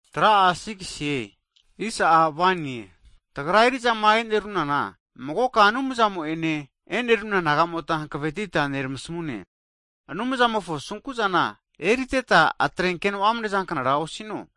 Hagi tagra eri'zama e'nerunana magoka Anumzamo'ene e'neruna nagamota hankavetita neramasmune, Anumzamofo asunku'zana eriteta, atrenkeno amnezanknara osino.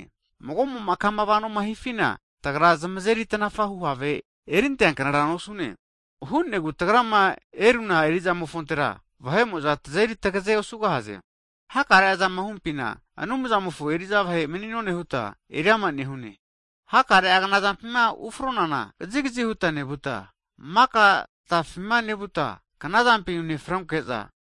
Hagi mago'mo'ma kama vanoma nehifina, tagra zamazeri tanafahu have erinteanknara nosune. Ana hu'negu tagrama eruna eri'zamofontera vahe'mo'za tazeri tagaze osugahaze. Hakare'azama humpina Anumzamofo eri'za vahe mani'none huta eriama nehune. Hakare'a knazampima ufronana kazigazi huta nevuta, maka tatafima nevuta, knazampina unefronke'za,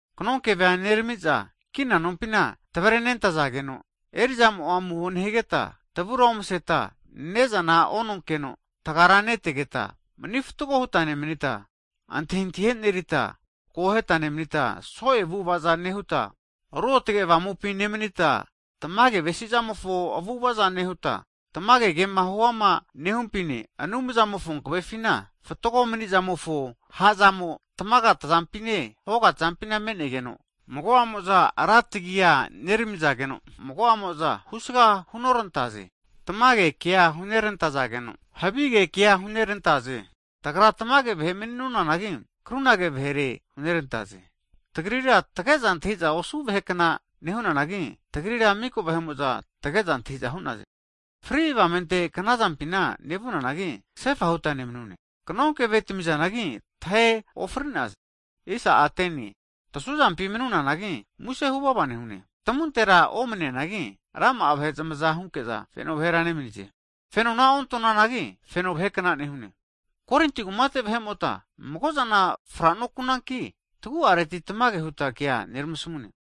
kanonkevea neramiza, kina nonpina tavrenentazageno, erizamo'a amuho nehigeta, tavura omaseta ne'zana ononkeno, tagazankura nehuta, manifatgo huta nemanita, antahintahia e'nerita, akoheta nemanita, so'e avu'ava zana nehuta, Ruotge Avamupina nemanita, tamage avesizamofo avu'ava zana nehuta, tamage kema huama nehumpine, Anumzamofo hankavefina, fatgo mani'zamofo ha'zamo'a tamaga tazampine hoga tazampina me'negeno, mago'amo'za rantagia neramizageno, mago'amo'za husaga hunorantaze. Tamage kea hunerantazageno, havige kea hunerantaze. Tagra tamage vahe mani'nonanagi, krunage vahere hunerantaze. Tagrira tage'za antahiza osu vahe kna nehunanagi, tagrira miko vahe'mo'za tage'za antahiza hu'naze. Fri avamente knazampina nevunanagi, kasefa huta nemanune, kanonkeve tami'nazanagi tahe ofri'naze. Hagi tasuzampi mani'nonanagi, muse huvava nehune, tamuntera omane'neanagi, rama'a vahe zamaza hunke'za feno vahera nemanize. Fenona onte'nonanagi (avamupina) feno vahekna nehune. Korinti kumate vahe'mota, magozana fra'nokunanki, tagu'areti tamage huta kea nermasamune.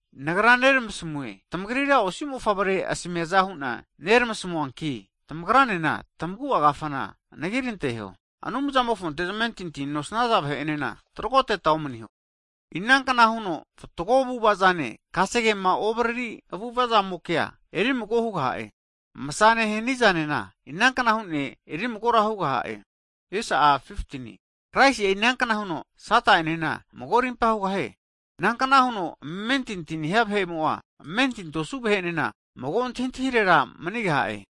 Nagra neramasamue, tamagrira osi mofavre asmiaza hu'na nermasamuanki, tamagranena tamagu'a kafana anagiranteho. Anumzamofonte zamentinti nosnaza vahe'enena tagroteta omaniho. Inankna huno fatgo avu'avazane, kasegema ovariri avu'avamokea erimago hugaha'e? Masazane hanizanena inankna hune erimagora hugaha'e? Kraisi'a inankna huno Sata'enena mago rimpa hugahie? Nankna huno amentinti nehia vahe'mo'a, amentinti osu vahe'enena, mago antahintahirera manigaha'e?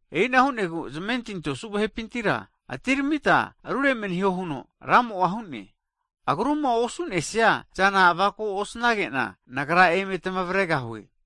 E'ina hu'negu, Zamentinti osu vahepintira atiramita rure maniho huno Ramo'a hu'ne. Agruma osu'nesia zana avako osinkena, Nagra eme tamavregahue.